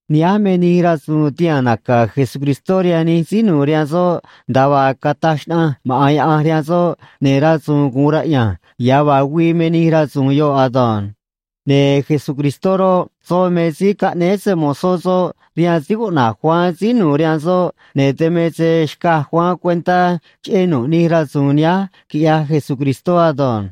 Nihánj me nij rasu̱u̱n tihaa̱n naca̱ Jesucristó rihaan nij síí nu̱u̱ rihaan soꞌ, nda̱a vaa cataj xnaꞌanj maꞌa̱n Yaꞌanj rihaan soꞌ, ne̱ rasu̱u̱n gu̱un raꞌya̱nj ya̱ vaa güii me nij rasu̱u̱n yoꞌ ado̱nj. Ne̱ Jesucristó roꞌ, soꞌ me síí caꞌnéé se‑mo̱zó soꞌ rihaan síí cuꞌna̱j Juan síí nu̱u̱ rihaan soꞌ, ne̱ dan me se xcaj Juan cuentá cheꞌé nu̱ꞌ nij rasu̱u̱n nihánj, quiꞌyaj Jesucristó ado̱nj.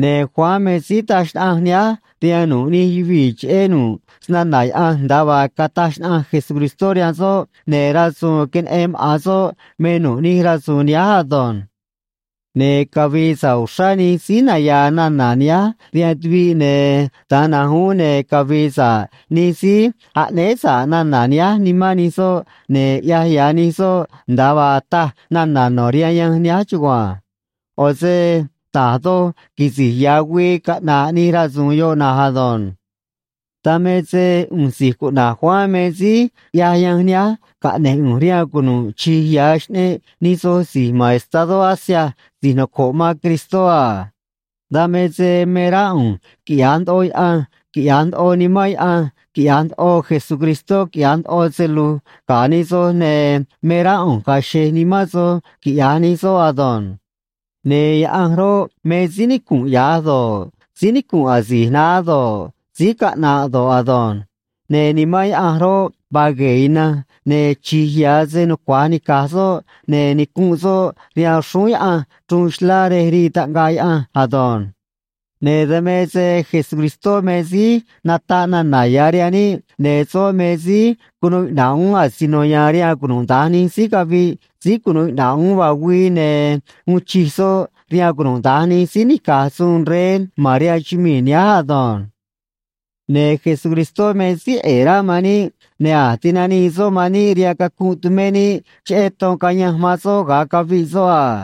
Ne̱ Juan me síí taj xnaꞌanj nihánj rihaan nu̱ꞌ nij yuvii̱ cheꞌé nu̱ꞌ snana̱ Yaꞌanj nda̱a vaa cataj xnaꞌanj Jesucristó rihaan soꞌ, ne̱ rasu̱u̱n queneꞌen maꞌa̱n soꞌ me nu̱ꞌ nij rasu̱u̱n nihánj ado̱nj. Ne̱ cavi̱i̱ sa̱ꞌ uxrá nij síí naya̱a̱ nana̱ nihánj rihaan tuviꞌ, ne̱ da̱nj na̱nj uún ne̱ cavi̱i̱ sa̱ꞌ nij síí aꞌnéé sa̱ꞌ nana̱ nihánj nimán nij soꞌ, ne̱ ya̱ ꞌyaj nij soꞌ nda̱a vaa taj nana̱ no̱ rihaan yanj nihánj chugua̱nj. ꞌO̱ se da̱j doj quisi̱j ya̱ güii caꞌna̱ꞌ nij rasu̱u̱n yoꞌ na̱nj ado̱nj. Dan me se ꞌu̱nj si̱j cuꞌna̱j Juan me síí ꞌyaj yanj nihánj, caꞌne̱j ꞌu̱nj rihaan cunu̱ꞌ chi̱j ya̱ xꞌneꞌ nij soj si̱j ma̱n estadó Asia si̱j noco̱ꞌ man Cristó a. Dan me se me rá ꞌu̱nj quiꞌya̱j ndoꞌo Yaꞌanj quiꞌya̱j ndoꞌo Nimán Yaꞌanj quiꞌya̱j ndoꞌo Jesucristó quiꞌya̱j ndoꞌo se lu̱j ga̱ nij soj, ne̱ me rá ꞌu̱nj ga̱a̱ xe̱j nimán soj, quiꞌya̱j nij soꞌ ado̱nj. Ne̱ Yaꞌanj roꞌ, me síí nicu̱nꞌ ya̱j do̱ꞌ, síí nicu̱nꞌ asi̱j naá do̱ꞌ, síí caꞌna̱ꞌ do̱ꞌ ado̱nj. Ne̱ Nimán Yaꞌanj roꞌ, vaa gue̱e̱ ina̱nj, ne̱ chi̱j ya̱ se nucua̱j nica̱j soꞌ, ne̱ nicu̱nꞌ soꞌ rihaan xrúún Yaꞌanj chruun xlá rej rii taꞌngaꞌ Yaꞌanj ado̱nj. Ne̱ dan me se Jesucristó me síí nataꞌ nana̱ ya̱ rihaan níꞌ, ne̱ soꞌ me síí cunuu iꞌna̱ꞌ uún asino ya̱a̱n rihaan cunuda̱nj nij síí caviꞌ síí cunu̱u iꞌna̱ꞌ uún vaa güii, ne̱ uun chij soꞌ rihaan cunuda̱nj nij síí nica̱j suun rey ma̱n rihaan chumii̱ nihánj ado̱nj. Ne̱ Jesucristó me síí ꞌe̱e̱ rá man níꞌ, ne̱ a̱j tinanii soꞌ man níꞌ rihaan cacunꞌ tumé níꞌ cheꞌé ton cayanj man soꞌ ga̱a caviꞌ soꞌ a.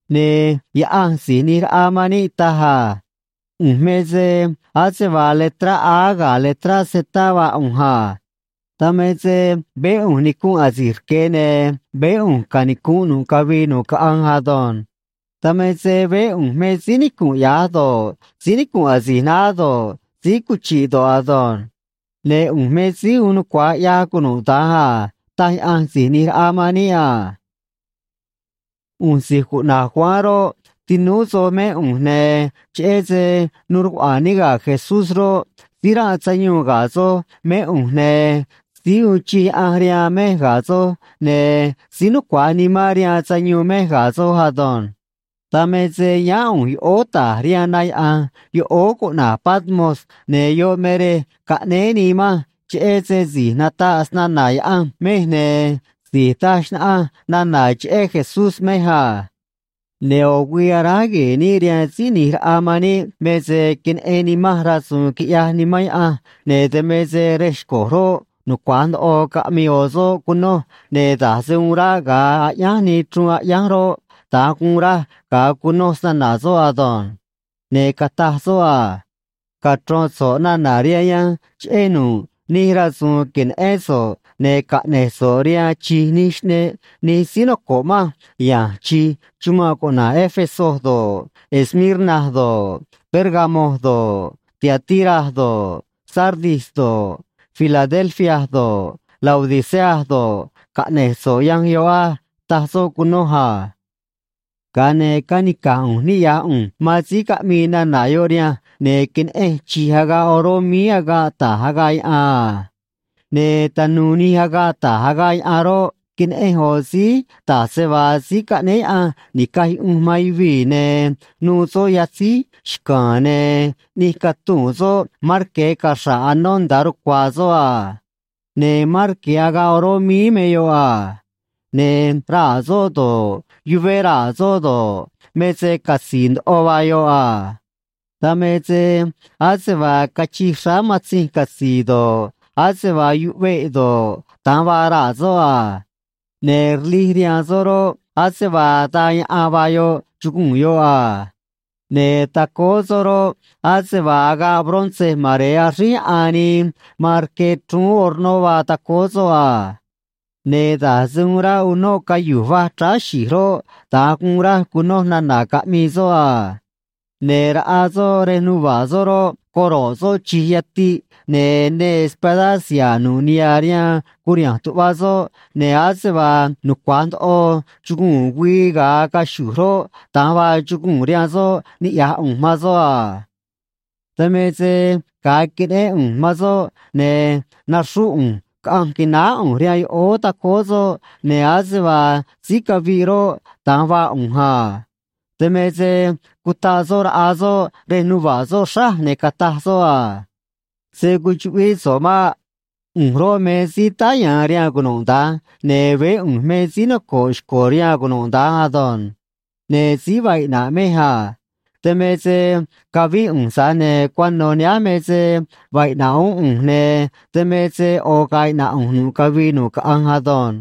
Ne̱ Yaꞌanj Si̱j ꞌNi̱j Raꞌa man níꞌ taj a: “ꞌU̱nj me se ase vaa letrá A ga̱ letrá Z vaa ꞌu̱nj a. Dan me se veé ꞌu̱nj nicunꞌ asi̱j rque̱, ne̱ veé ꞌu̱nj canicu̱nꞌ nu̱ꞌ cavii nu̱ꞌ caꞌanj ado̱nj. Dan me se veé ꞌu̱nj me síí nicunꞌ ya̱j do̱ꞌ, síí nicunꞌ asi̱j naá do̱ꞌ, síí cuchi̱ꞌ do̱ꞌ ado̱nj. Ne̱ ꞌu̱nj me Síí Uun Nucua̱j ꞌYaj Cunuda̱nj a”, taj Yaꞌanj Si̱j ꞌNi̱j Raꞌa man níꞌ a. ꞌU̱nj si̱j cuꞌna̱j Juan roꞌ, tinúú soj mé ꞌu̱nj, ne̱ cheꞌé se nuu rcuꞌa̱a̱n níꞌ ga̱ Jesús roꞌ, síí ranꞌ sayuun ga̱ soj mé ꞌu̱nj, ne̱ síí uun chij Yaꞌanj rihaan mej ga̱ soj, ne̱ síí nucua̱j nimán rihaan sayuun mej ga̱ soj ado̱nj. Dan me se yáán ꞌu̱nj yoꞌóó ta̱j rihaan na yaꞌa̱nj yoꞌóó cuꞌna̱j Patmos, ne̱ yoꞌ me rej caꞌnéé nii manj cheꞌé se si̱j nataꞌ snana̱ Yaꞌanj mej ne̱ si̱j taj xnaꞌanj nana̱ cheꞌé Jesús mej a. Ne̱ ꞌo̱ güii aráj gue̱e̱ níꞌ rihaan Síí ꞌNi̱j Raꞌa man níꞌ me se queneꞌen nimanj rasu̱u̱n quiꞌyaj Nimán Yaꞌanj, ne̱ dan me se rej xco̱j roꞌ, nucua̱j ndoꞌo caꞌmii ꞌo̱ soꞌ cunoj, ne̱ da̱j se uun ráꞌ ga̱a aꞌyánj nii chruun aꞌyánj roꞌ, da̱nj guun raj ga̱a cunoj snana̱ soꞌ ado̱nj. Ne̱ cataj soꞌ a: ―Cachro̱n so̱ꞌ nana̱ rihaan yanj cheꞌé nu̱ꞌ nij rasu̱u̱n que̱neꞌén so̱ꞌ, ne̱ caꞌne̱j so̱ꞌ rihaan chi̱j nij xꞌneꞌ nij síí noco̱ꞌ manj ya̱nj chi̱j chumanꞌ cuꞌna̱j Éfeso do̱ꞌ, Esmirna do̱ꞌ, Pérgamo do̱ꞌ, Tiatira do̱ꞌ, Sardis do̱ꞌ, Filadelfia do̱ꞌ, Laodicea do̱ꞌ, caꞌne̱j so̱ꞌ yanj yoꞌ á ―taj soꞌ cunoj a. Ga̱a ne̱ canica̱j ꞌu̱nj ni̱ꞌyaj ꞌu̱nj man síí caꞌmii nana̱ yoꞌ rihanj, ne̱ queneꞌenj chi̱j agaꞌ oró míí agaꞌ ta̱j agaꞌ yaꞌan a. Ne̱ tanu̱u̱ nij agaꞌ ta̱j agaꞌ yaꞌan roꞌ, queneꞌenj ꞌo̱ síí da̱j se vaa Síí Caꞌnéé Yaꞌanj Ni̱caj Yuꞌunj man Yuvii̱, ne̱ nu̱u̱ soꞌ yatzíj xca̱a̱n, ne̱ ꞌni̱j catuu̱n soꞌ marque̱ caxra̱ꞌ anó nda̱a rucua̱a̱ soꞌ a. Ne̱ marque̱ agaꞌ oró míí me yoꞌ a. Ne̱ raa̱ soꞌ do̱ꞌ, yuvé raa̱ soꞌ do̱ꞌ, me se catzi̱i̱ ndoꞌo vaa yoꞌ a. Dan me se ase vaa cachij xráá matzinj catzi̱i̱ do̱ꞌ, ase vaa yuꞌveꞌ do̱ꞌ, da̱nj vaa raa̱ soꞌ a. Ne̱ rlij rihaan soꞌ roꞌ, ase vaa daa yaꞌan vaa yoꞌ, chuguu̱n yoꞌ a. Ne̱ tacóó soꞌ roꞌ, ase vaa agaꞌ bronce mare̱e axríj yaꞌan nii man rque chrúún hornó vaa tacóó soꞌ a. Ne̱ da̱j se uun ráꞌ unóꞌ cayu̱j va̱j chráá xi̱j roꞌ, da̱nj guun raj cunoj nana̱ caꞌmii soꞌ a. Ne̱ raꞌa soꞌ rej nuva̱ꞌ soꞌ roꞌ, coro̱ꞌ soꞌ chi̱j yatiꞌ, ne̱ neê espadá siha̱a̱ nu̱ꞌ niha̱ rihaan curiha̱nj tuꞌva soꞌ, ne̱ ase vaa nucua̱j ndoꞌo chuguu̱n güii ga̱a caxu̱j roꞌ, da̱nj vaa chuguu̱n rihaan soꞌ niꞌya̱j ꞌu̱nj man soꞌ a. Dan me se ga̱a queneꞌén ꞌu̱nj man soꞌ, ne̱ naxrúꞌ ꞌu̱nj caꞌanj qui̱náá ꞌu̱nj rihaan yoꞌóó tacóó soꞌ, ne̱ ase vaa síí caviꞌ roꞌ, da̱nj vaa ꞌu̱nj a. Dan me se cutaꞌ soꞌ raꞌa soꞌ rej nuva̱ꞌ soꞌ xráj, ne̱ cataj soꞌ a: ―Se̱ cuchuꞌvíꞌ so̱ꞌ maꞌ. ꞌU̱nj roꞌ, me síí táá ya̱a̱n rihaan cunuda̱nj, ne̱ veé ꞌu̱nj me síí noco̱ꞌ xco̱ rihaan cunuda̱nj ado̱nj. Ne̱ síí vaa iꞌna̱ꞌ mej a. Dan me se cavíꞌ ꞌu̱nj, tza̱j ne̱ cuano̱ nihánj me se vaa iꞌna̱ꞌ uún ꞌu̱nj, ne̱ dan me se ꞌo̱ ga̱a̱ iꞌna̱ꞌ ꞌu̱nj nu̱ꞌ cavii nu̱ꞌ caꞌanj ado̱nj.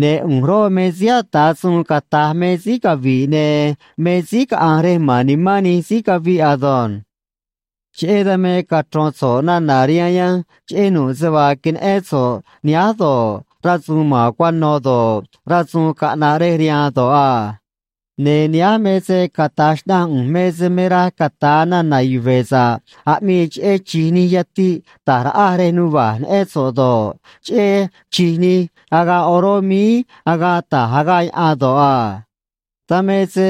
Ne̱ ꞌu̱nj roꞌ, me síí ata̱ suun cata̱j me síí cavi̱ꞌ ne̱ me síí caꞌa̱nj rej ma̱n nimán nij síí caviꞌ ado̱nj. ’Cheꞌé dan me cachro̱n so̱ꞌ nana̱ rihaan yanj cheꞌé nu̱ꞌ se vaa queneꞌén so̱ꞌ nihánj do̱ꞌ, rasu̱u̱n ma̱n cuano̱ do̱ꞌ, rasu̱u̱n caꞌna̱ꞌ rej riha̱a̱n do̱ꞌ a. Ne̱ nihánj me se cata̱j xnaꞌanj ꞌu̱nj me se me raj cata̱a nana̱ yuve̱ sa̱ꞌ aꞌmii cheꞌé chi̱j nij yatiꞌ ta̱j raꞌaj rej nuva̱ꞌ neꞌén so̱ꞌ do̱ꞌ, cheꞌé chi̱j nij agaꞌ oró míí agaꞌ ta̱j agaꞌ yaꞌan do̱ꞌ a. Dan me se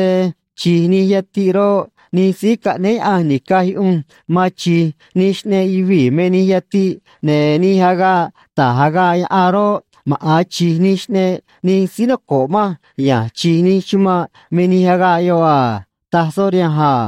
chi̱j nij yatiꞌ roꞌ, nij síí caꞌnéé Yaꞌanj ni̱caj yuꞌunj man chi̱j nij xꞌneꞌ yuvii̱ me nij yatiꞌ, ne̱ nij agaꞌ ta̱j agaꞌ yaꞌan roꞌ, maꞌa̱n chi̱j nij xꞌneꞌ nij síí noco̱ꞌ manj ya̱nj chi̱j nij chumanꞌ me nij agaꞌ yoꞌ a ―taj soꞌ rihanj a.